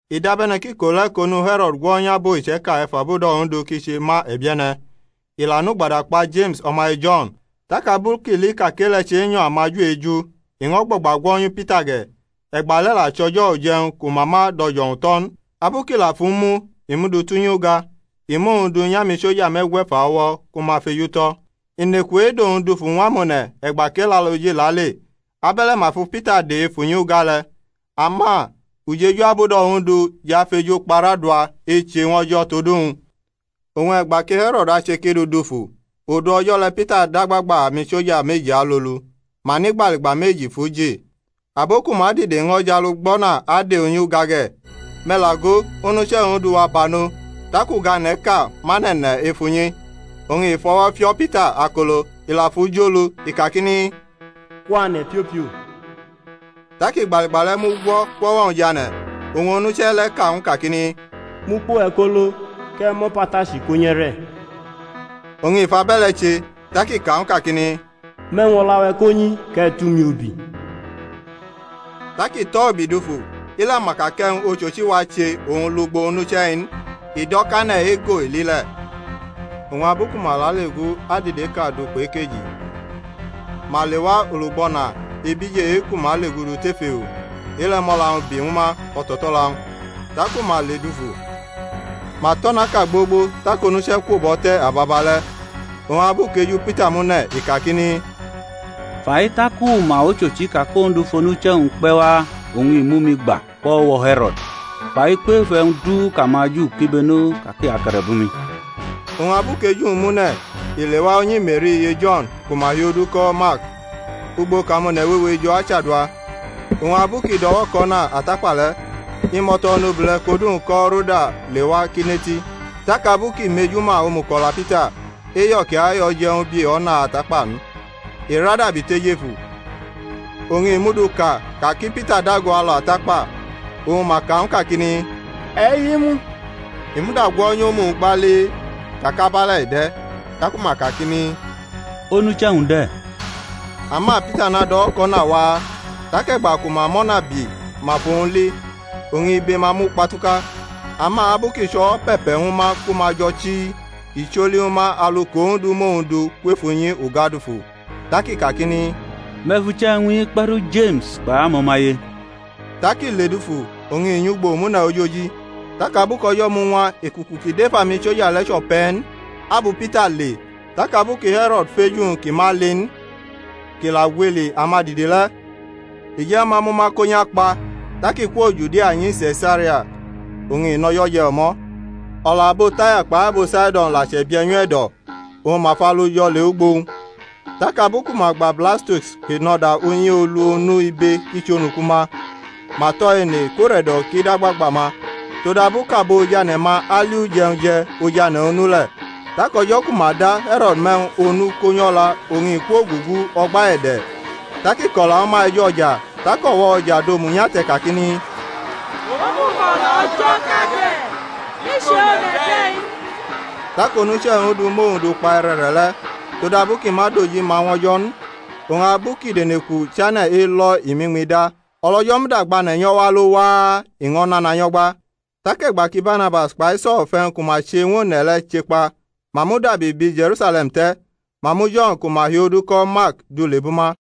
I dabe̩ne̩ kʼiko le̩ kʼonu He̩ro̩d gwo̩nyʼabo iche̩ka ef abudo̩ Ondu kʼi che ma e̩bie̩ne̩. I la nʼugbada kpa Jeme̩s o̩maye Jo̩n. Tak abu kʼi li ka kʼe-le̩ chenyo̩ amaJu eju, i ño̩ gbo̩gba gwo̩nyu Pita ge̩. (E̩gbale̩ la chʼo̩jo̩ uje̩wñ ku ma ma dʼo̩jo̩wu tʼo̩ n.) Abu kʼi la fʼu mu, i mʼu du tʼunyi uga; i mʼowñ du nyʼamisoja me̩gwe̩fa o̩wo̩ ku ma fejutʼo̩. I neku edʼowñ dufu ñw amone̩ e̩gba kʼElaloji lale. Abe̩le̩ ma fi Pita de ef unyi uga le̩. Ama ujeju abudo̩ Ondu jʼafejukparʼadua eche ñw O̩jo̩ tod uwñ. Oñ e̩gba ki He̩ro̩d ache kʼi dʼu dufu, odu o̩jo̩ le̩ Pita dʼagbagba amisoja meji alolu, ma nʼigbaligba meji fʼu ji; abo ku ma dide ño̩ jʼalugbo̩na ade unyi uga ge̩. Me̩ la go, onuche̩ Ondu wa banʼo, tak ugane̩ʼka mʼane̩ ne̩ ef unyi: oñ i fʼo̩wo̩ fio̩ Pita akolo, i la fʼu jʼolu, i kakini, Kwane̩ piopio. Tak igbaligba le̩ mugwo̩ kwʼo̩wo̩-wñ jʼane̩. Oñ onuche̩ le̩ ka ñw u kakini, Mʼukpo-we̩ ko lo, kʼe̩ mʼo̩patachi ko̩ nyʼe̩re̩. Oñ i fʼabe̩le̩ che. Tak i ka ñw u kakini, Mʼe̩wñ o̩la-we̩ ko nyi kʼe̩ tʼumi ubi. Tak i tʼo̩ ubi dufu, i la ma ka kʼe̩wñ ochochi wache owñ lugbo onuche̩-i n, i do̩ kʼane̩ ego i li le̩. Oñ abu ku ma lale gu adide ʼka du kpʼekeji, ma lewa olugbo̩na ebije e-ku ma legudu tef ewo; e-le̩ mʼo̩la-wñ bi ñw ma o̩to̩to̩la-wñ; taku ma ledufu, ma tʼo̩naʼka gbogbo tak onuche̩ kwo bʼo̩ te̩ ababale̩. Oñ abu kʼeju Pita mune̩, i kakini, Fai tak u ma ochochi ka kʼOndu fʼonuche̩-wñ kpe̩ wa oñ i mʼumi gba kwʼo̩wo̩ He̩ro̩d kpai kwef e̩wñ du kʼamaJu kibeno ka ki ake̩re̩bʼumi. Oñ abu kʼeju-wñ mune̩, i lewa unyi Me̩ri iye Jo̩n ku ma hi odu ko̩ Mark, ugbo kʼamone̩ wewe jo̩ achadua. Oñ abu kʼi do̩wo̩kʼo̩na atakpa le̩, imo̩to̩ onobule̩ kʼodu-wñ ko̩ Roda lewa kʼi neti. Tak abu kʼi mejuma omuko̩la Pita, eyo̩ kʼi ayo̩ je̩ ñw u bi o̩na atakpa n, i ra dabi tʼejefu, oñ i muduka ka ki Pita dago alu atakpa. Oñ ma ka ñw u kakini, E̩ himu. I muda gwo̩nyʼomu-wñ gbali ka kʼabe̩le̩ i de̩. Taku ma kakini, Onuche̩-wñ de̩. Ama Pita nado̩wo̩kʼo̩na waa; tak e̩gba ku ma mʼo̩na bi ma fʼowñ li, oñ ibe-ma mukpatuka. Ama abu kʼi chʼo̩wo̩ pe̩pe̩ ñw ma ku ma jo̩ chii, i choli ñw ma alu kʼOndu mʼowñ du kwef unyi uga dufu. Tak i kakini, Me̩ fʼuche̩ e̩wñ-i kpe̩ru Jeme̩s kpai amo̩maye. Tak i ledufu, oñ i nyʼugbo omune̩ ojoji. Tak abu kʼo̩jo̩ muñwa ekuku ki dʼef amiso̩ja le̩ chʼo̩pe̩ n, abu Pita le? Tak abu ki He̩ro̩d fej uwñ kʼi ma li n, kʼi la gwili amadide le̩, i je̩ ñw ma mʼuma ko nyʼakpa. Tak i kwo Judia nyi Se̩saria, oñ i nʼo̩jo̩ je̩ o̩mo̩. O̩la abo Taya kpai abo Saido̩n la chʼe̩bie̩ nyʼu e̩do̩; oñ ma falujo̩ lewʼugbo-wñ, tak abu ku ma gba Blastus ki nʼo̩da unyi olu onu ibe kʼi chʼonuku-ma, ma tʼo̩ ene kʼure̩do̩ ki dʼagbagba-ma, todabu kʼabo ojane̩-ma ali uje̩wñ je̩ ojane̩ onu le̩. Tak o̩jo̩ ku ma da He̩ro̩d mʼe̩wñ onu ko̩ nyʼo̩la oñ i kwogugu o̩gba e̩de̩, tak i ko̩la ñwu ma ej o̩ja. Tak o̩wo̩ o̩ja dʼomu nyate̩ kakini, Omuko̩la o̩jo̩ʼka de̩, i chʼe-one̩ de̩-i n. Tak onuche̩ Ondu mʼowñ du kpa e̩re̩re̩le̩, todabu kʼi ma dʼojima ñw O̩jo̩ n. Oñ abu kʼideneku chane̩ elo̩ i mʼiñmi da. O̩lO̩jo̩ muda gbʼane̩ nyʼo̩wo̩ alo waa, i ño̩ nana nyo̩gba. Tak e̩gba ki Barnabas kpai So̩l fʼe̩wñ ku ma che ñw one̩ le̩ che kpa ma mudabi bi Je̩rusale̩m te̩; ma mu Jo̩n ku ma hi odu ko̩ Mark du lebʼuma.